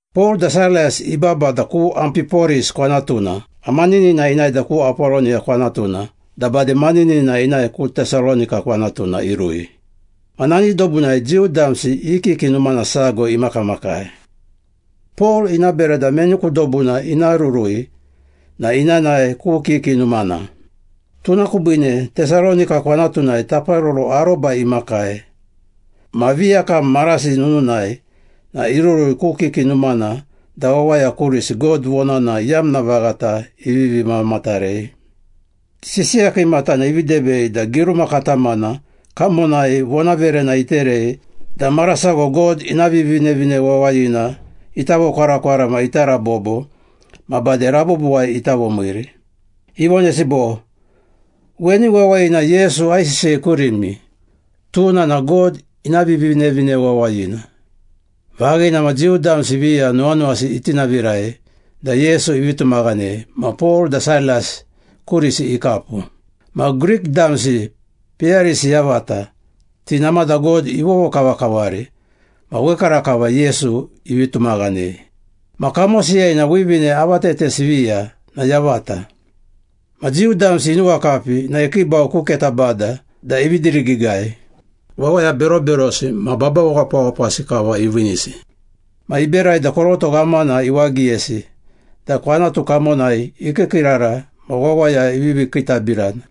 Pol da Sailas ibaba da ku Ampiporis kwanatuna ma maninina inae da ku Apoloniya kwanatuna da bade maninina inae ku Tesalonika kwanatuna irui. Ma nani dobunai Jiu damsi i kiki numana sago imakamakai. Pol ina bera da meni ku dobuna ina rurui na ina nae ku kiki numana. Tuna kubiine Tesalonika kwanatunai taparoro aroba imakai ma viyakam marasi nununai na irurui ku kiki numana da wawaya kurisi God vonana iyamna vaghata ivivi mamatarei. Sisiya kiimatana ivi debei da giruma katamana kamonai vonaverena iterei da mara sago God ina Vivinevine Wawayina ita vokwarakwara ma ita rabobo ma bade rabobowai ita vomiiri. Ivonesi bo, “Weni wawayina Yesu aisisiyei kurimi, tuna na God ina Vivinevine Wawayina.” Vaghina ma Jiu damsi viya nuwanuwasi itinavirai da Yesu ivi tumaghanei ma Pol da Sailas kurisi ikapu. Ma Grik damsi peyarisi yavata, ti namada God ivovokavakavari ma wekarakava Yesu ivi tumaghanei. Ma kamosiyai na wivine avatetesi viya na yavata. Ma Jiu damsi inuwakapi na ikiibau ku keta bada da ivi dirigiigai, wawaya beroberosi ma babawapawapasi kava iviinisi. Ma iberai da koroto ghamana iwagiyesi da kwanatu kamonai ikiikiirara ma wawaya ivivi kiitabirana.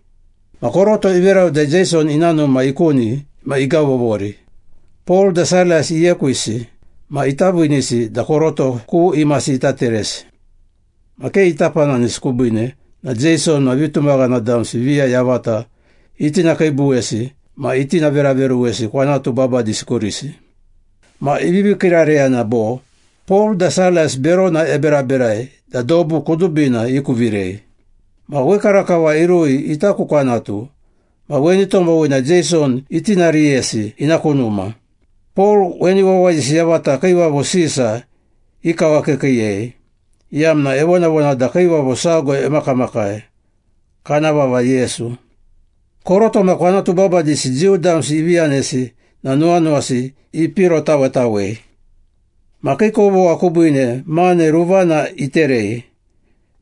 Ma koroto iverau da Jeison ina numa ikuni ma igavovori, Pol da Sailas iekwisi ma ita viinisi da koroto ku imasi ita teresi. Ma ke ita pananisi kubiine na Jeison ma vitumaghana damsi viya yavata itinakiibuwesi ma itinaveraveruwesi kwanatu babadisi kurisi. Ma ivivi kiirareyana bo, “Pol da Sailas berona eberaberai da dobu kudubina ikuvirei! Ma wekarakava irui ita ku kwanatu ma weni tomowina Jeison itinariyesi ina ku numa. Pol weni wawayisi yavata Kiivavo Sisa ikawakiikiiyei, iyamna evonavona da kiivavo sago emakamakai, kana vava Yesu.” Koroto ma kwanatu babadisi Jiu damsi ivi yanesi na nuwanuwasi ipirotawetawei. Ma kii kovogha kubiine mane ruvana iterei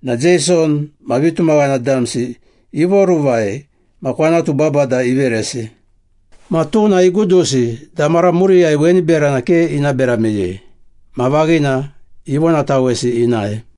na Jeison ma vitumaghana damsi ivoruvai ma kwanatu babada iveresi. Ma tuna igudusi da mara muriyai weni berana ke ina bera meyei. Ma vaghina ivonatawesi inae.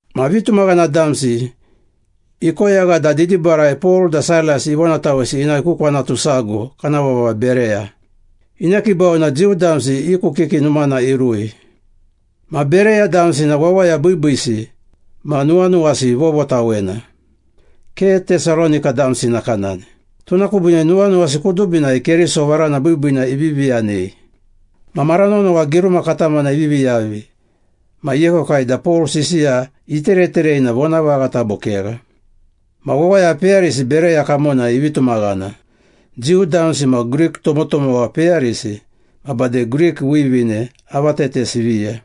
Ma vitumaghana damsi ikoyagha da didibarai Pol da Sailas ivonatawesi inae ku kwanatu sago kana vava Bereya. Inekiibau ma Jiu damsi i ku kiki numana irui. Ma Bereya damsi na wawaya biibiisi ma nuwanuwasi vovotawena, ke Tesalonika damsi nakanani. Tuna kubiine nuwanuwasi kudubinai Keriso varana biibiina ivivi yanei. Ma mara nonowa giruma katamana ivivi yavi ma iekwekwai da Pol sisiya itereterei na vonavaghata bo kegha. Ma wawaya peyarisi Bereya kamonai ivi tumaghana, Jiu damsi ma Grik tomotomowa peyarisi ma bade Grik wivine avatetesi viya.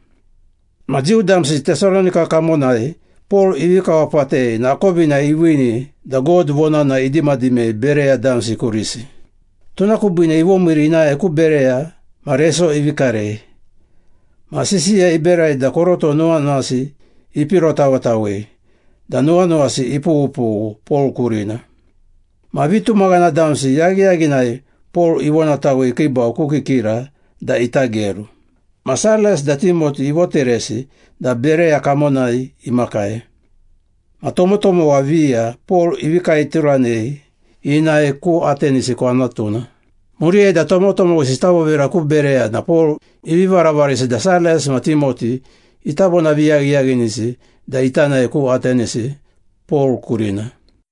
Ma Jiu damsi Tesalonika kamonai Pol ivi kawapatei na akovina iviini da God vonana idimadimei Bereya damsi kurisi. Tuna kubiine ivomiiri inae ku Bereya ma reso ivi karei, ma sisiya iberai da koroto nuwanuwasi ipirotawetawei da nuwanuwasi ipughupughu Pol kurina. Ma vitumaghana damsi yaghiyaghinai Pol ivonatawei ikiibau ku kikira da ita geru. Ma Sailas da Timoti ivoteresi da Bereya kamonai imakai. Ma tomotomowa viya Pol ivi kaeturanei inae ku Atenisi kwanatuna. Muriyai da tomotomowisi ita vovira ku Bereya na Pol ivi varavarisi da Sailas ma Timoti ita vonaviyaghiyaghinisi da ita nae ku Atenisi, Pol kurina.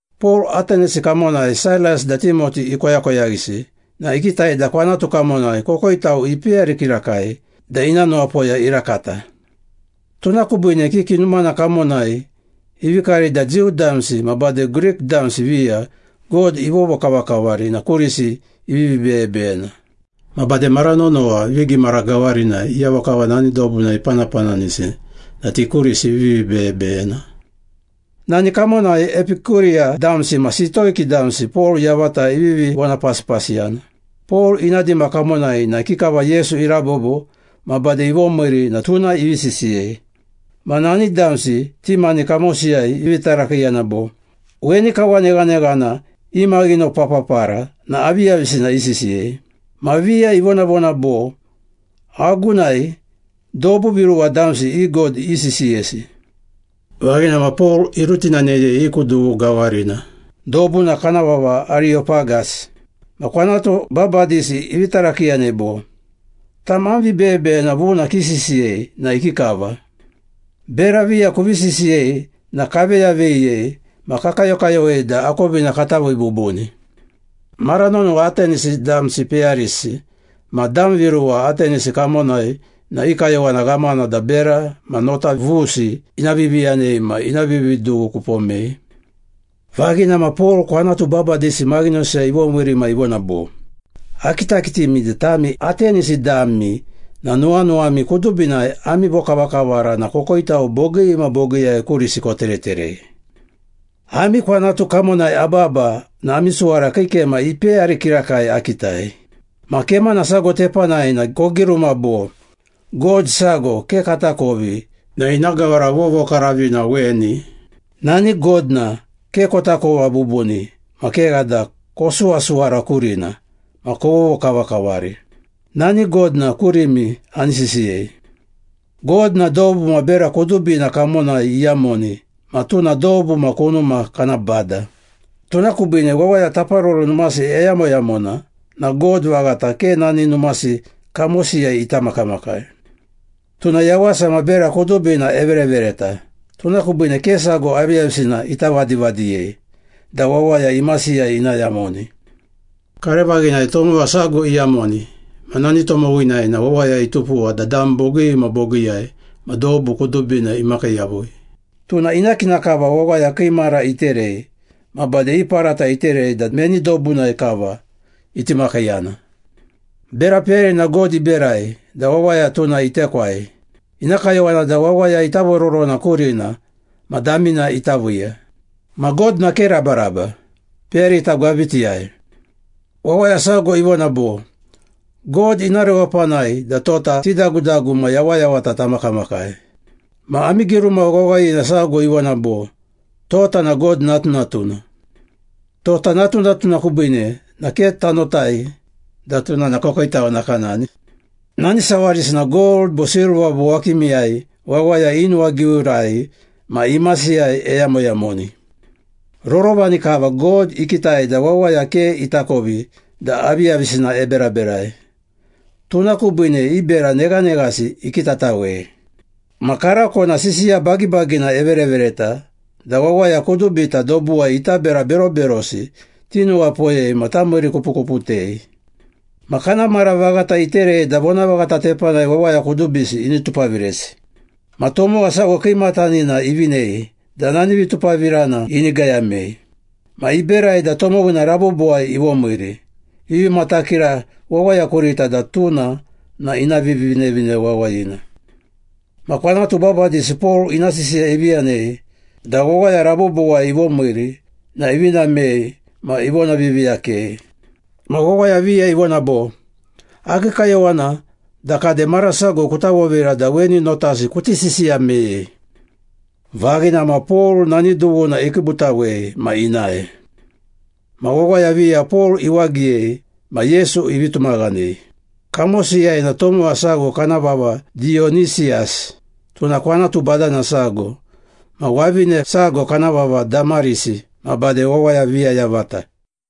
Pol Atenisi kamonai Sailas da Timoti ikoyakoyaghisi na ikitai da kwanatu kamonai kokoitau ipeyari kirakai da ina nuwapoya irakata. Tuna kubiine kiki numana kamonai ivi karei da Jiu damsi ma bade Grik damsi viya God ivovokavakavari na kurisi ivivi beyebeyena. Ma bade mara nonowa vigimara gawarinai iyavo kava nani dobunai ipanapananisi na ti kurisi ivivi beyebeyena. Nani kamonai Epikuriya damsi ma Sitoiki damsi Pol yavata ivivi vonapasipasiyana. Pol ina dima kamonai na ikikava Yesu irabobo ma bade ivomiiri na tuna ivi sisiyei. Ma nani damsi ti mani kamosiyai ivi tarakiiyana bo, “Weni kawa neghaneghana imaghinopapapara na aviyavisina isisiyei?” Ma viya ivonavona bo, “Agunai dobu viruwa damsi i god isisiyesi.” Vaghina ma Pol irutinaneyei i ku dughu gawarina, dobuna kana vava Ariyopagas. Ma kwanatu babadisi ivi tarakiiyanei bo, “Tam am vibeyebeyena vuna kisisiyei na ikikava? Bera viya kuvi sisiyei na kaveyaveyiyei ma kakayokayowei da akovina kata vii bubuni.” Mara nonowa Atenisi damsi peyarisi ma dam viruwa Atenisi kamonai na i kayowana ghamana da bera ma nota vusi ina viviyanei ma ina vividughu kupomei. Vaghina ma Pol kwanatu babadisi maghinosiyai ivomiiri ma ivona bo, “Akitakitimi da tami Atenisi dami na nuwanuwami kudubinai ami vokavakavara na kokoitau bogii ma bogiiyai kurisi kotereterei. Ami kwanatu kamonai ababa na ami suwara kii kema ipeyari kirakai akitai. Ma kemana sago tepanai na kogiruma bo, ‘God sago ke katakovi na ina gawara vovokaravina weni.’ Nani God na ke kotakova bubuni ma kegha da kosuwasuwara kurina ma kovovokavakavari. Nani God na kurimi ani sisiyei. God na dobu ma bera kudubina kamonai iyamoni ma tuna dobu ma kunuma kana bada. Tuna kubiine wawaya taparoro numasi eyamoyamona na God vaghata ke nani numasi kamosiyai ita makamakai. Tuna yawasa ma bera kudubina everevereta, tuna kubiine ke sago aviyavisina ita vadivadiyei da wawaya imasiyai ina yamoni. Karevaghinai tomowa sago kava iyamoni ma nani tomowinai na wawaya itupuwa da dam bogii ma bogiiyai ma dobu kudubina imakii yavui. Tuna ina kina kava wawaya kii mara iterei ma bade i parata iterei da meni dobunai kava iti makiiyana. Bera peyarina God iberai da wawaya tuna itekwai. Ina kayowana da wawaya ita vororona kurina ma damina ita viiya. Ma God na ke rabaraba, peyarita gwabitiyai. Wawaya sago ivona bo, ‘God ina rewapanai da tota tidagudagu ma yawayawata tamakamakai.’ Ma ami giruma wawayina sago ivona bo, ‘Tota na God natunatuna.’ Tota natunatuna kubiine na ke tanotai da tuna na kokoitau nakanani. Nani sawarisi na gold bo silva bo wakimiyai wawaya i nuwagiurai ma imasiyai eyamoyamoni. Rorovani kava God ikitai da wawaya ke itakovi da aviyavisina eberaberai, tuna kubiine i bera neghaneghasi ikitatawei. Ma karako na sisiya bagibagina everevereta da wawaya kudubita dobuwai ita bera beroberosi tinuwapoyei ma tamiirikupukuputei. Ma kana mara vaghata iterei da vonavaghata tepanai wawaya kudubisi ini tupaviresi. Ma tomowa sago kiimatanina ivinei da nani vitupavirana ini gayamei. Ma iberai da tomowina rabobowai ivomiiri, ivi matakira wawaya kurita da tuna na ina Vivinevine Wawayina.” Ma kwanatu babadisi Pol ina sisiya ivi yanei da wawaya rabobowai ivomiiri na ivi namei ma ivonaviiviiyakei. Ma wawaya viya ivona bo, “Akii kayowana da kade mara sago kuta vovira da weni notasi kuti sisiya meyei.” Vaghina ma Pol nani dughuna ikiibutawei ma inae. Ma wawaya viya Pol iwagiyei ma Yesu ivi tumaghanei. Kamosiyai na tomowa sago kana vava Diyonisiyas, tuna kwanatu badana sago, ma wavine sago kana vava Damarisi ma bade wawaya viya yavata.